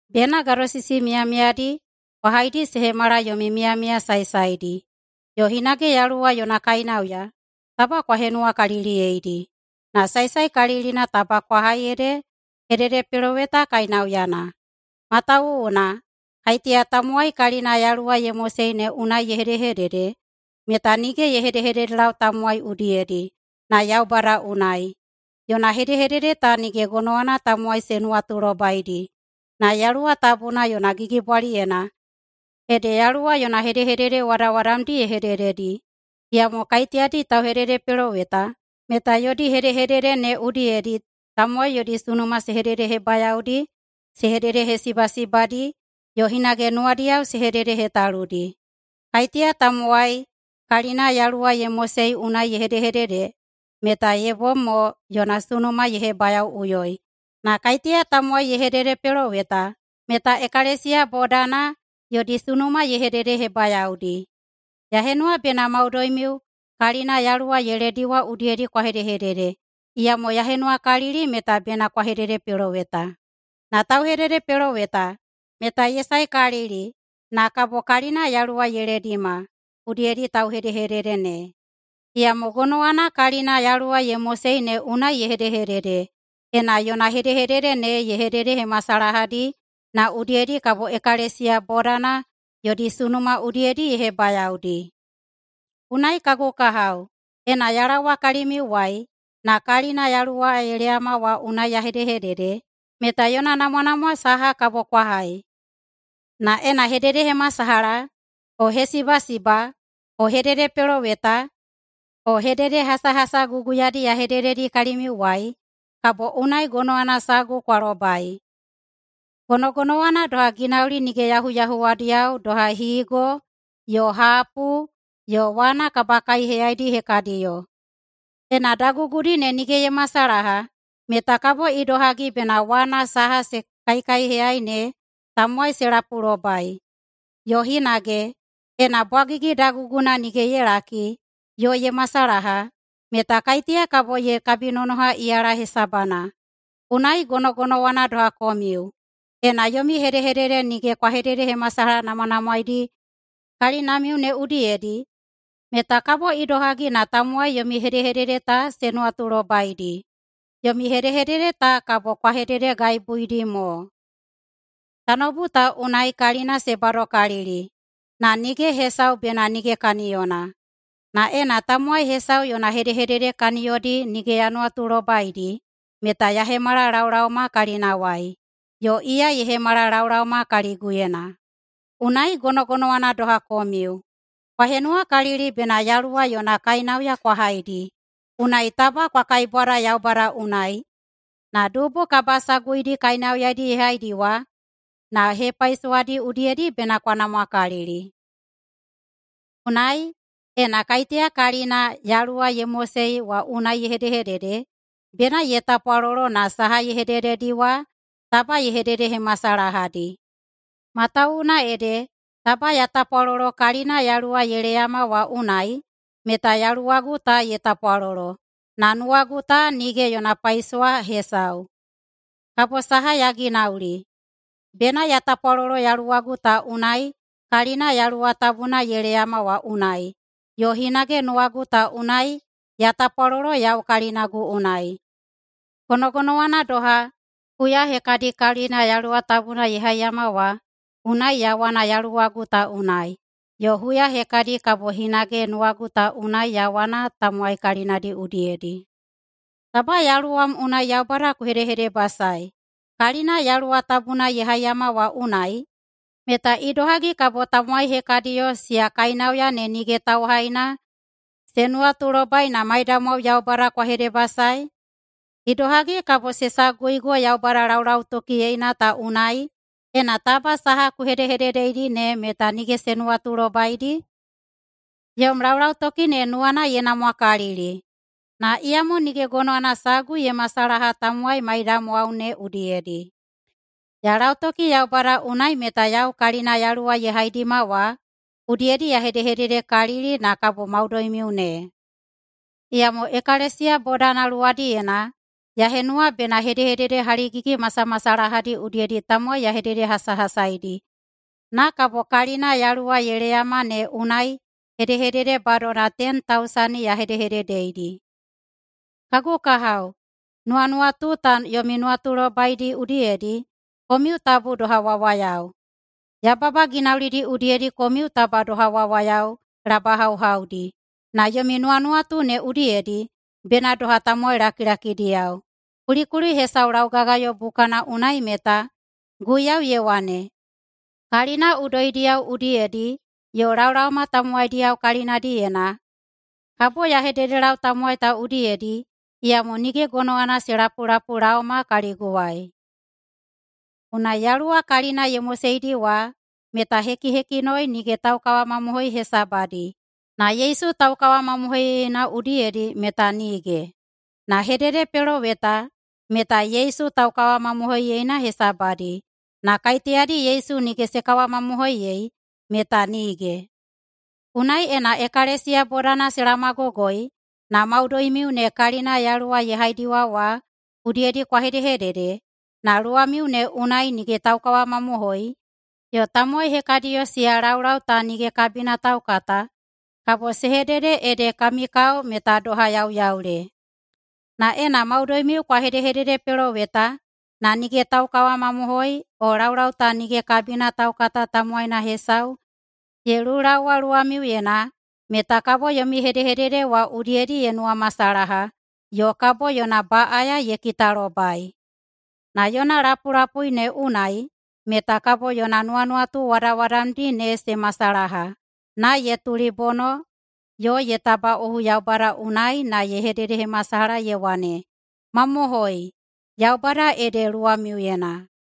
Bena gadosisi miyamiyadi kwa haidi se hemala yomi miyamiya saesaedi. Yo hinage Yaluwa yona kainauya taba kwa henuwakaliliyeidi, na saesaekalilina taba kwa hai ede hededepeloweta kainauyana. Matawuwuna kaiteya tamowai kalina Yaluwa ye mosei ne unai ye hedehedede meta nige ye hedehededelau tamowai udiyedi na Yaubada unai. Yona hedehedede ta nige gonowana tamowai se nuwatulobaidi, na Yaluwa Tabuna yona gigibwaliyena ede Yaluwa yona hedehedede wadawadamdi ye hedededi. Iyamo kaiteyadi tauhededepeloweta meta yodi hedehedede ne udiyedi tamowai yodi sunuma se hededehebayaodi, se hededehesibasibadi yo hinage nuwadiyao se hededehetaludi. Kaiteya tamowai kalina Yaluwa ye mosei unai ye hedehedede meta ye bom mo yona sunuma ye hebayaoꞌuyoi, na kaiteya tamowai ye hededepeloweta meta ekalesiya bodana yodi sunuma ye hededehebayaodi. Ya henuwa bena maudoimiu kalina Yaluwa ye lediwa udiyedi kwa hedehedede, iyamo ya henuwakalili meta bena kwa hededepeloweta. Na tauhededepeloweta meta ye saekalili na kabo kalina Yaluwa ye ledima udiyedi tauhedehedede ne. Iyamo gonowana kalina Yaluwa ye mosei ne unai ye hedehedede, ena yona hedehedede ne ye hededehemasalahadi na udiyedi kabo ekalesiya bodana yodi sunuma udiyedi ye hebayaodi. Unai kagu kahao, ena ya laowa kalimiuwai na kalina Yaluwa ye leyama wa unai ya hedehedede meta yona namwanamwa saha kabo kwa hai? Na ena hededehemasalaha o hesibasiba o hededepeloweta o hededehasahasa guguyadi ya hedededi kalimiuwai, kabo unai gonowana sagu kwa lobai. Gonogonowana doha ginauli nige yahuyahuwadiyao doha higo yo hapu yo wana kabakaiheyaidi hekadiyo. Ena dagugudi ne nige ye masalaha meta kabo idohagi bena wana saha se kaikaiheyai ne tamowai se lapulobai? Yo hinage, ena bwagigi daguguna nige ye laki yo ye masalaha meta kaiteya kabo ye kabinonoha iyala hesabana? Unai gonogonowana doha komiu, ena yomi hedehedede nige kwa hededehemasalahanamwanamwaeidi kalinamiu ne udiyedi meta kabo idohagi na tamowai yomi hedehedede ta se nuwatulobaidi? Yomi hedehedede ta kabo kwa hededegaibuidi mo. Tanoubu ta unai kalina se badokalili, na nige hesau bena nige kaniyona. Na ena tamowai hesau yona hedehedede kaniyodi nige ya nuwatulobaidi meta ya hemala laolaoma kalinawai yo iya ye hemala laolaoma kaliguyena. Unai gonogonowana doha komiu. Kwa henuwakalili bena Yaluwa yona kainauya kwa haidi, unai taba kwa kaibwada Yaubada unai na dubu kabasaguidi kainauyadi ye haidiwa na hepaisowadi udiyedi bena kwa namwakalili. Unai, ena kaiteya kalina Yaluwa ye mosei wa unai ye hedehedede, bena ye tapwalolo na saha ye hedededi wa taba ye hededehemasalahadi. Matawuwuna ede, taba ya tapwalolo kalina Yaluwa ye leyama wa unai meta yaluwagu ta ye tapwalolo, na nuwagu ta nige yona paisowa hesau. Kabo saha ya ginauli? Bena ya tapwalolo yaluwagu ta unai kalina Yaluwa Tabuna ye leyama wa unai, yo hinage nuwagu ta unai ya tapwalolo yau kalinagu unai. Gonogonowana doha, huya hekadi kalina Yaluwa Tabuna ye haiyama wa unai ya wana yaluwagu ta unai, yo huya hekadi kabo hinage nuwagu ta unai ya wana tamowai kalinadi udiyedi. Taba yaluwam unai Yaubada ku hedehedebasaei kalina Yaluwa Tabuna ye haiyawa wa unai, meta idohagi kabo tamowai hekadiyo siya kainauya ne nige tauhaina se nuwatulobai na maidamwao Yaubada kwa hedebasaei? Idohagi kabo se saguigo Yaubada laulautokiyeina ta unai, ena taba saha ku hedehededeidi ne meta nige se nuwatulobaidi? Yom laulautoki ne nuwana ye namwakalili, na iyamo nige gonowana sagu ye masalaha tamowai maiyamwao ne udiyedi. Ya lautoki Yaubada unai meta yau kalina Yaluwa ye haidima wa udiyedi ya hedehededekalili na kabo maudoimiu ne. Iyamo ekalesiya bodana luwadiyena ya henuwa bena hedehedede haligigi masamasalahadi udiyedi tamowai ya hededehasahasaidi na kabo kalina Yaluwa ye leyama ne unai hedehedede badona ten tausani ya hedehededeidi. Kagu kahao, nuwanuwatu ta yomi nuwatulobaidi udiyedi komiu tabu doha wawayao. Yababa ginaulidi udiyedi komiu taba doha wawayao labahauhaudi, na yomi nuwanuwatu ne udiyedi bena doha tamowai lakilakidiyao. Kulikuli hesau laugagayo bukana unai meta, “Guiyau ye wane, ‘Kalina udoidiyao udiyedi yo laolaoma tamowaidiyao kalinadiyena kabo ya hededelau tamowai ta udiyedi, iyamo nige gonowana se lapulapulaoma kaliguwai.’” Unai Yaluwa kalina ye moseidi wa meta hekihekinoi nige taukawamamohoi hesabadi, na Yesu taukawamamohoiyeina udiyedi meta nige. Na hededepeloweta meta Yesu taukawamamohoiyena hesabadi, na kaiteyadi Yesu nige se kawamamohoiyei meta nige. Unai, ena ekalesiya bodana se laomagogoi na maudoimiu ne kalina Yaluwa ye haidiwa wa udiyedi kwa hedehedede, na luwamiu ne unai nige taukawamamohoi yo tamowai hekadiyo siya laulau ta nige kabina taukata, kabo se hedede ede kami kao meta doha yauyaule. Na ena maudoimiu kwa hedehededepeloweta na nige taukawamamohoi o laulau ta nige kabina taukata tamowaina hesau ye lulaowa luwamiuyena, meta kabo yomi hedehedede wa udiyedi ye nuwamasalaha yo kabo yona baꞌaya ye kitalobai. Na yona lapulapui ne unai meta kabo yona nuwanuwatu wadawadamdi ne se masalaha na ye tulibono yo ye tabaꞌohu Yaubada unai na ye hededehemasalaha ye wane, “Mamohoi, Yaubada ede luwamiuyena!”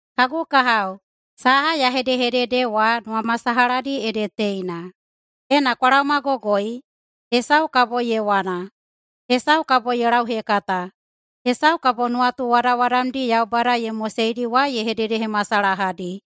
Kagu kahao, saha ya hedehedede wa nuwamasalahadi ede teina: Ena kwa laomagogoi, hesau kabo ye wana, hesau kabo ye lauhekata, hesau kabo nuwatu wadawadamdi Yaubada ye moseidi wa ye hededehemasalahadi,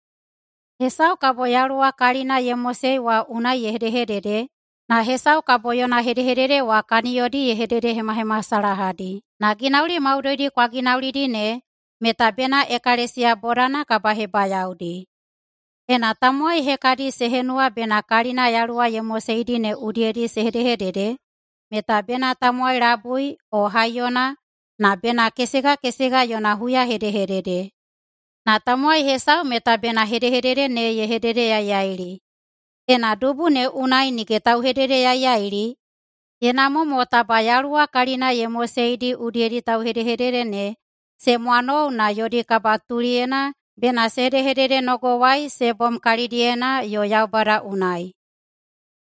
hesau kabo Yaluwa kalina ye mosei wa unai ye hedehedede, na hesau kabo yona hedehedede wa kaniyodi ye hededehemahemasalahadi. Na ginauli maudoidi kwa ginaulidi ne meta bena ekalesiya bodana kabahebayaodi. Ena tamowai hekadi se henuwa bena kalina Yaluwa ye moseidi ne udiyedi se hedehedede meta bena tamowai labui o haiyona, na bena kesegakesega yona huyahedehedede, na tamowai hesau meta bena hedehedede ne ye hededeyaiyaili. Ena dubu ne unai nige tauhededeyaiyaili, ye namwa mo taba Yaluwa kalina ye moseidi udiyedi tauhedehedede ne se mwanou na yodi kabatuliyena bena se hedehededenogowai se bom kalidiyena yo Yaubada unai.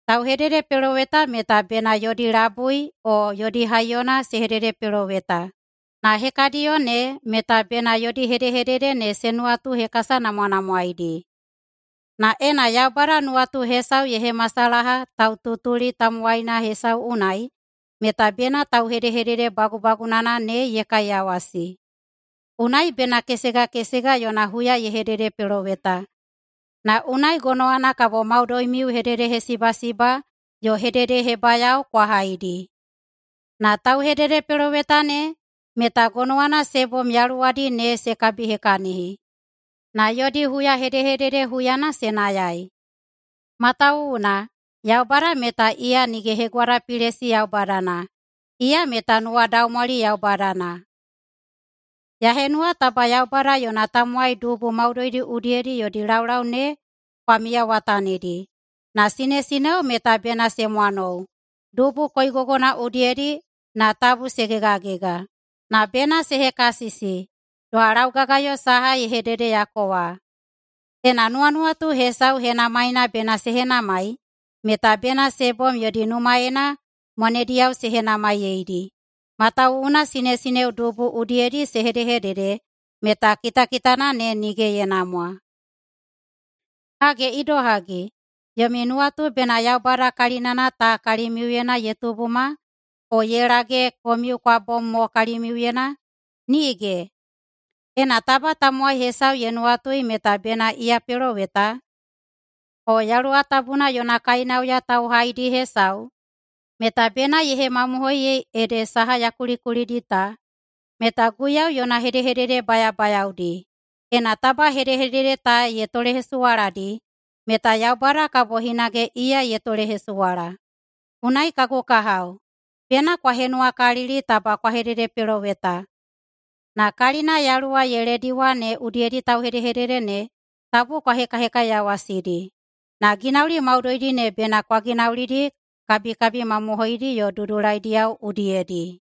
Tauhededepeloweta meta bena yodi labui o yodi haiyona se hededepeloweta, na hekadiyo ne meta bena yodi hedehedede ne se nuwatuhekasanamwanamwaeidi. Na ena Yaubada nuwatu hesau ye hemasalaha taututuli tamowaina hesau unai meta bena tauhedehedede bagubagunana ne ye kaiyawasi. Unai bena kesegakesega yona huya ye hededepeloweta, na unai gonowana kabo maudoimiu hededehesibasiba yo hededehebayao kwa haidi. Na tauhededepeloweta ne meta gonowana se bom yaluwadi ne se kabihekahini na yodi huyahedehedede huyana se nayai. Matawuwuna Yaubada meta iya nige hegwadapilesi Yaubadana. Iya meta nuwadaumwali Yaubadana. Ya henuwa taba Yaubada yona tamowai dubu maudoidi udiyedi yodi laulau ne kwa miyawatanidi na sinesineo meta bena se mwanou dubu koigogodi udiyedi na tabu se gegagega. Na bena se hekasisi, doha laugagayo saha ye hededeyako wa. Ena nuwanuwatu hesau henamaina bena se henamai, meta bena se bom yodi numaena mwanediyao se henamaiyeidi, matawuwuna sinesineo dubu udiyedi se hedehedede meta kitakitana ne nige ye namwa. Hage idohagi, yomi nuwatu bena Yaubada kalinana ta kalimiuyena ye tubuma, o ye lage komiu kwa bom mo kalimiuyena? Nige! Ena taba tamowai hesau ye nuwatui meta bena iya peloweta o Yaluwa Tabuna yona kainauya tauhaidi hesau, meta bena ye hemamohoiyei ede saha ya kulikulidi ta meta Guiyau yona hedehedede bayabayaodi. Ena taba hedehedede ta ye tolehesuwaladi meta Yaubada kabo hinage iya ye tolehesuwala. Unai kagu kahao, bena kwa henuwakalili taba kwa hededepeloweta, na kalina Yaluwa ye lediwa ne udiyedi tauhedehedede ne tabu kwa hekahekaiyawasidi. Na ginauli maudoidi ne bena kwa ginaulidi kabikabi mamohoidi yo dudulaidiyao udiyedi.